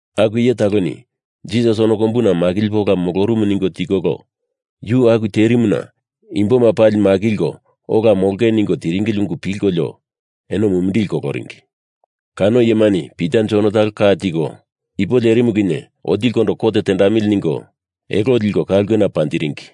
Aku iye taloni Jisas ono kombuna makilipe ola molorumu ningo tikolo yu aku terimuna imboma pali makilko ola molonge ningo tiringili ungu pilkolio eno mumindili koloringi. Kano iyemani Pita Jon talo ka tiko, ipo lerimu kinye otilikondo kot teamili ningo elo liko ka ulkena panjiringi.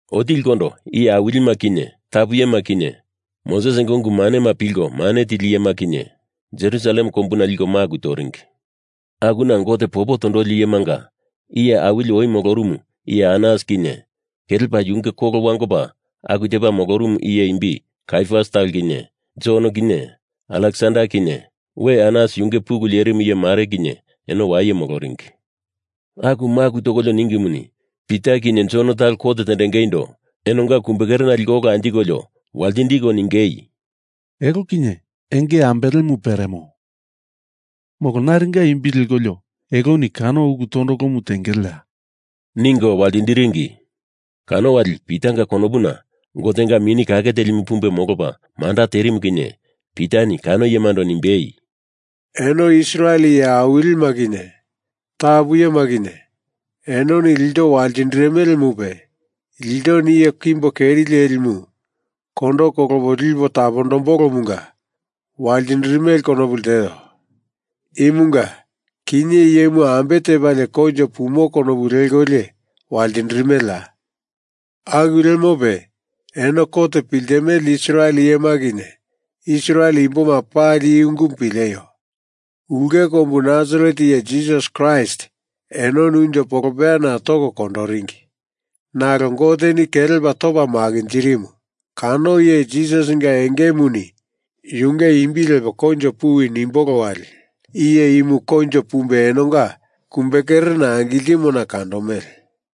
Otilikondo iye awilima kinye tapu iyema kinye Mosesinga ungu manema pilko mane tili iyema kinye Jerusalem kombuna liko maku toringi. Akuna Gote popo tondoli iyemanga iye awili oi molorumu iye Anas kinye kelepa yunge kolo wangopa aku tepa molorumu iye imbi Kaiafas talo kinye Jon kinye Aleksander kinye we Anas yunge pulu lerimu iye mare kinye eno waye moloringi. Aku maku tokolio ningimuni Pita kinye Jon talo kot tendengeindo enonga kumbekerena liko ola anjikolio waltindiko ningei, “Elo kinye enge ambelemu peremo, molo naringa imbi lekolio eloni kano ulu tondolomu tengeleya?” ningo waltindiringi. Kano wali Pitanga konopundo Gotenga Mini Kake Telimu pumbe molopa manda tenderimu kinye Pitani kano iyemando nimbei, “Eno Israel iye awilima kinye tapu iyema kinye enoni ilto waltindirimelemupe, iltoni iye kimbo keri leli imu kondo kolopo lipo tapondombolomunga waltindirimele konopu lteo. Imunga kinye iyemu ambe tepalie koinjo pumo konopu lekolio waltindirimeleya? Aku lemope eno kot piltimele Israel iyema kinye Israel imboma pali i ungumu pileio! Ulke kombu Nasaret iye Jisas Kraist enoni unjo polopeyana toko kondoringi. Nalo Goteni kelepa topa makinjirimu. Kano iye Jisasinga engemuni yunge imbi lepo koinjo puwi nimbolo wali iye imu koinjo pumbe enonga kumbekerena angiltimona kandomele.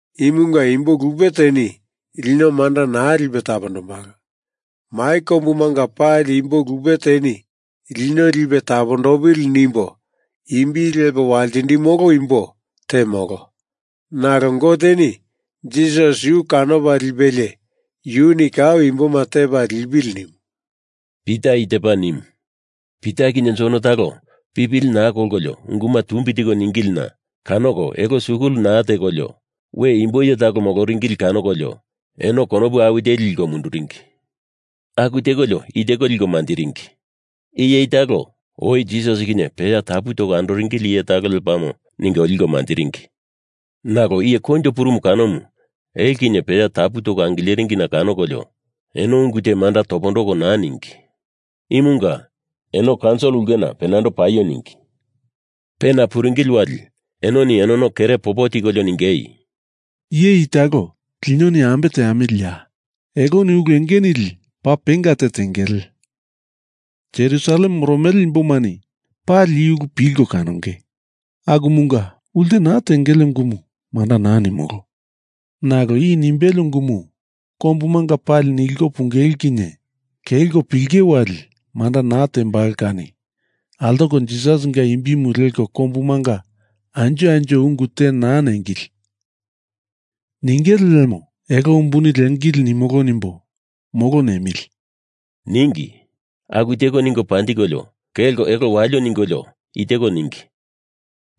Imunga imbo lupe teni lino manda naa lipe tapondombalo. Mai kombumanga pali imbo lupe teni lino lipe tapondopili nimbo imbi lepo waltindimolo imbo te molo, nalo Goteni Jisas yu kanopa lipelie yuni kau imboma tepa lipili nimu,” Pita i tepa nimu. Pita kinye Jon talo pipili naa kolkolio unguma tumbi tiko ningilina kanoko elo skul naa tekolio we imbo iye talo moloringili kanokolio eno konopu awi teli liko munduringi. Aku tekolio i teko liko manjiringi. Iye i talo oi Jisas kinye peya tapu toko andoringili iye talo lepamo ningo liko manjiringi. Nalo iye koinjo purumu kanomu elo kinye peya tapu toko angileringina kanokolio eno ungu te manda topondoko naa ningi. Imunga eno kaunsil ulkena penando paio ningi. Pena puringili wali enoni enono kere popo tikolio ningei, “Iye i talo linoni ambe teamiliya? Eloni ulu enge nili paa penga te tengele. Jerusalem moromele imbomani pali i ulu pilko kanonge. Akumunga ulte naa tengele ungumu manda naa nimolo. Nalo i nimbele ungumu kombumanga pali niliko pungele kinye kelko pilinge wali manda naa tembalo kani altoko Jisasinga imbimu leko kombumanga anjo anjo ungu te naa nengili. Ningele lemo elo umbuni liengili nimolo nimbo, molo nemili,” ningi. Aku teko ningo panjikolio kelko elo walio ningolio i teko ningi,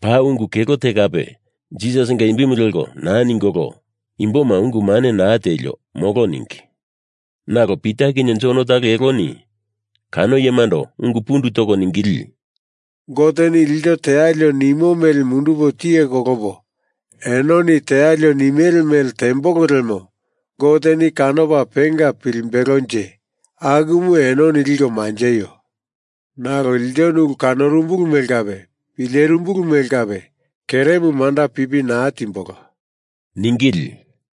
paa ungu kelo te kape Jisasinga imbimu leko naa ningolo, imboma ungu mane naa tielio, molo ningi. Nalo Pita kinye Jon talo eloni kano iyemando ungu pundu toko ningili, “Goteni ilto tealio nimo mele mundupo tiye kolopo enoni tealio nimele mele tembolo lemo Goteni kanopa penga pilimbelonje akumu enoni liko manjeio. Nalo ilto ulu kanorumbulu mele kape pilerimbulu mele kape keremu manda pipi naa timbolo,” ningili.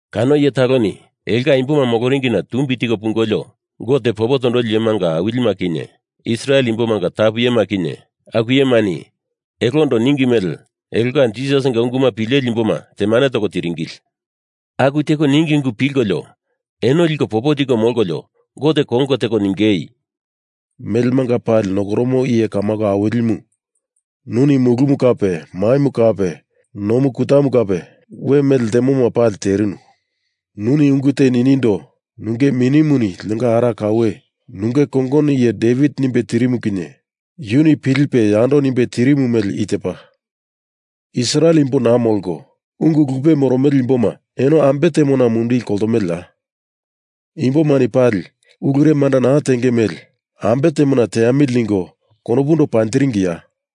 Kano iye taloni elonga imboma moloringina tumbi tiko pungolio Gote popo tondoli iyemanga awilima kinye Israel imbomanga tapu iyema kinye aku iyemani elondo ninge mele elonga Jisasinga ungumu pileli imboma temane toko tiringili. Aku teko ninge ungu pilkolio eno liko popo tiko molkolio Gote konge teko ningei, “Melemanga pali nokoromo iye kamako awilimu, nuni mulumu kape maimu kape nomu kutamu kape we mele ltemoma pali terinu. Nuni ungu te ninindo nunge Minimuni linonga ara kaue nunge kongono iye Devit nimbe tirimu kinye yuni pilipe yando nimbe tirimu mele i tepa, Israel imbo naa molko ungu lupe moromele imboma eno ambe temona mumindili koltomeleya? Imbomani pali ulure manda naa tenge mele ambe temona teamili ningo konopundo panjiringiya?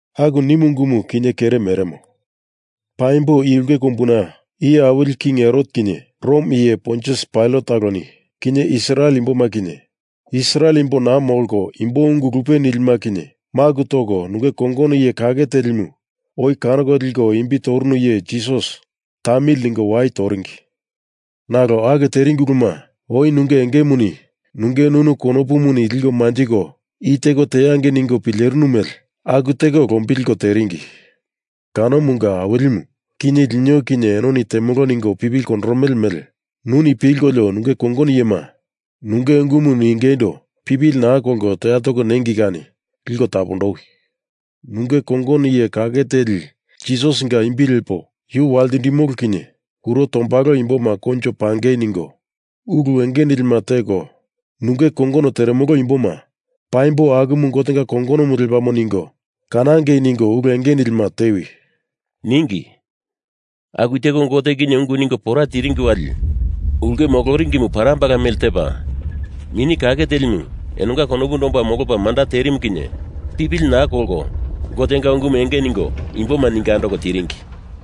Aku nimu ungumu kinye kere meremo. Paimbo i ulke kombuna iye awili king Herot kinye Rom iye Pontius Pailat taloni kinye Israel imboma kinye Israel imbo naa molko imbo ungu lupe nilima kinye maku toko nunge kongono iye kake telimu oi kanoko liko imbi torunu iye Jisas tamili ningo wai toringi. Nalo aku teringi uluma oi nunge engemuni nunge nunu konopuni liko manjiko i teko teangei ningo pilerinu mele aku teko lombilko teringi. Kanomunga Awilimu kinye lino kinye enoni temolo ningo pipili kondoromele mele nuni pilkolio nunge kongono iyema nunge ungumu ningeindo pipili naa kolko toya toko nengei kani liko tapondowi. Nunge kongono iye kake teli Jisasinga imbi lepo yu waltindimolo kinye kuro tombalo imboma koinjo pangei ningo ulu enge nilima teko nunge kongono teremolo imboma paimbo akumu Gotenga kongonomu lepamo ningo kanangei ningo ulu enge nilima tewi,” ningi. Aku teko Gote kinye ungu ningo pora tiringi wali ulke moloringimu parambala mele tepa Mini Kake Telimu enonga konopundo omba molopa manda terimu kinye pipili naa kolko Gotenga ungumu enge ningo imboma ningo andoko tiringi.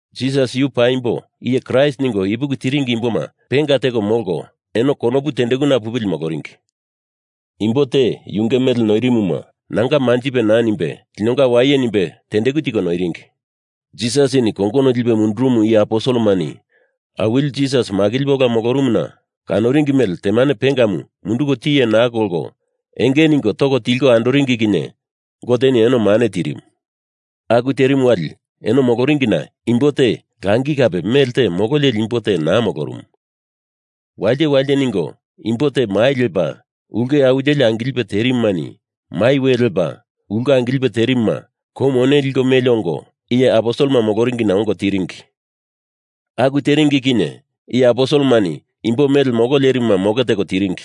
Jisas yu paimbo iye Kraist ningo ipuki tiringi imboma penga teko molko eno konopu tendekuna pupili moloringi. Imbo te yunge mele noirimuma nanga manjipe naa nimbe linonga waye nimbe tendeku tiko noiringi. Jisasini kongono lipe mundurumu iye aposelemani Awili Jisas makilipe ola molorumuna kanoringi mele temane pengamu munduko tiye naa kolko enge ningo toko tilko andoringi kinye Goteni eno mane tirimu. Aku terimu wali eno moloringina imbo te langi kape melte molo leli imbo te naa molorumu. Walite walite ningo imbo te mai lepa ulke awi teli angilipe terimumani mai we lepa ulke angilipe terimuma kou mone liko meli ongo, iye aposelema moloringina ongo tiringi. Aku teringi kinye iye aposelemani imbo mele molo lerimuma moke teko tiringi.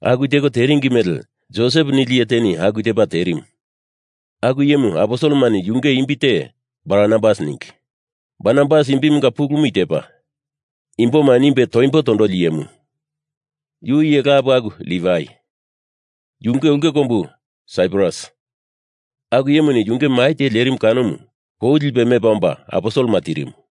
Aku teko teringi mele Josep nili iye teni aku tepa terimu. Aku iyemu aposelemani yunge imbi te Barnabas ningi. Barnabas imbimunga pulumu i tepa, imboma nimbe toimbo tondoli iyemu. Yu iye lapu aku Livai, yunge ulke kombu Saiprus. Aku iyemuni yunge mai te lerimu kanomu kou lipelie mepa omba aposelema tirimu.